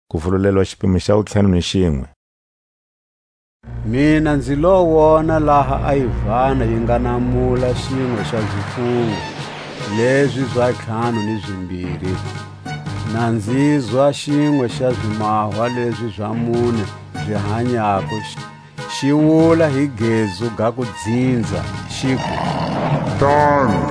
A ntlhanu wa zifungo ni zimbiri. Mina nzi lo wona laha a Yivana yi nga namula xinwe xa zifungo lezi za ntlhanu ni zimbiri; na nzizwa xinwe xa ximahwa lezi za mune zi hanyako, xi wula hi gezu ga kudzinza, xiku: Tana!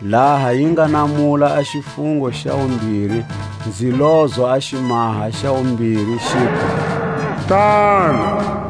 Laha yi nga namula a xifungo xa wumbiri, nzi lozwa a ximahwa xa wumbiri, xiku: Tana!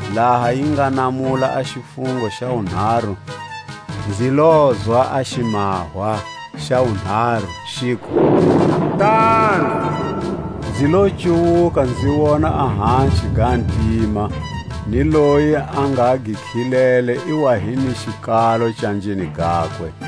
Laha yi nga namula a xifungo xa wunharu, nzi lozwa a ximahwa xa wunharu, xiku: Tana! Nzi lo cuwuka nzi wona a haxi ga ntima, ni loyi a nga gi khilele i wa hi ni xikalo canjeni gakwe.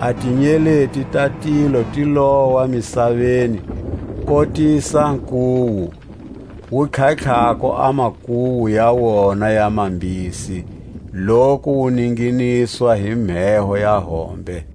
A tinyeleti ta tilo ti lowa misaveni, kotisa nkuwu wu tlhatlhako a makuwu ya wona ya mambisi, loku wu ninginizwa hi mheho ya hombe.